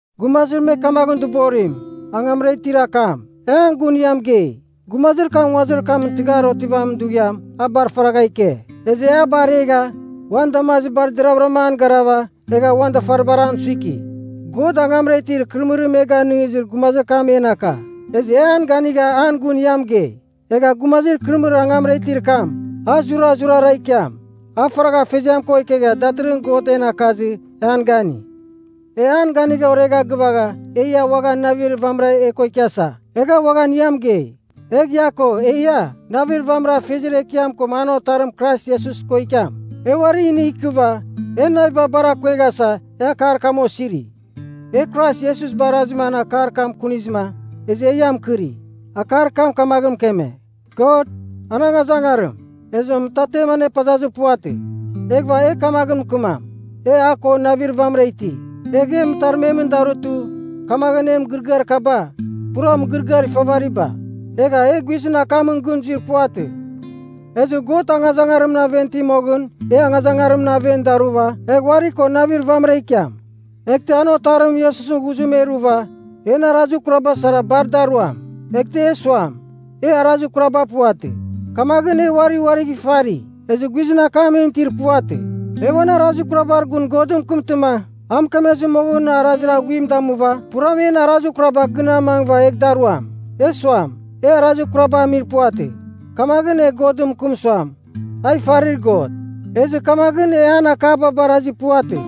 Gumazir me kamaghɨn dɨborim, Angamra Itir Akam, e an gun ia mɨgei. Gumazir kam nguazir kam tɨghar otivamin dughiam a bar faragha ike, ezɨ e a baregha, uan damazibar deravɨram an garava egha uan dafaribar an suiki. God angamra itir ikɨrɨmɨrir e ganɨngizir gumazir kam en aka, ezɨ e an ganigha an gun ia mɨgei. Egha gumazir ikɨrɨmɨrir angamra itir kam, a zurazurara ikiam. A faragha Afeziam ko ikegha datɨrɨghɨn God en akazɨ e an gani. E an ganigha oregha gɨvagha, e ia uaghan navir vamɨra e ko ikiasa, egha uaghan ia mɨgei. Egh ia ko, eia navir vamɨra Afeziar Ekiam ko an Otarim Krais Iesus ko ikiam. E uari inigh ikɨva, en naviba bar akueghasa, e akar kam osiri. E Krais Iesus barazima an akar kam kunizɨma, ezɨ e ia mɨkɨri. Akar kam kamaghɨn mɨkeme, God, an angazangarim, ezɨma mɨtarmetam anepazazir puvatɨ. Eghɨva e kamaghɨn mɨkɨmam, “E a ko navir vamɨra iti,” egha e mɨtarmemɨn darutɨ, kamaghɨn en mɨgɨrɨgɨar kaba, pura mɨgɨrɨgɨar ifavariba. Egha e guizɨn akamɨn gɨn zuir puvatɨ. Ezɨ God angazangarimɨn aven iti moghɨn e angazangarimɨn aven daruva egh uari ko navir vamɨra ikiam. Eghtɨ an Otarim Iesusɨn ghuzim e ruva, en arazir kuraba sara bar da ruam. Eghtɨ e suam, “E arazir kuraba puvatɨ,” kamaghɨn e uari uarigh ifari, ezɨ guizɨn akam en itir puvatɨ. E uan arazir kurabar gun Godɨn mɨkɨmtɨma, a mɨkemezɨ moghɨn arazir aghuim damuva puram en arazir kuraba gɨn amangɨva egh da ruam. E suam, “E arazir kurabagh amir puvatɨ,” kamaghɨn e Godɨn mɨkɨm suam, “A ifarir God.” Ezɨ kamaghɨn e an akaba barazir puvatɨ.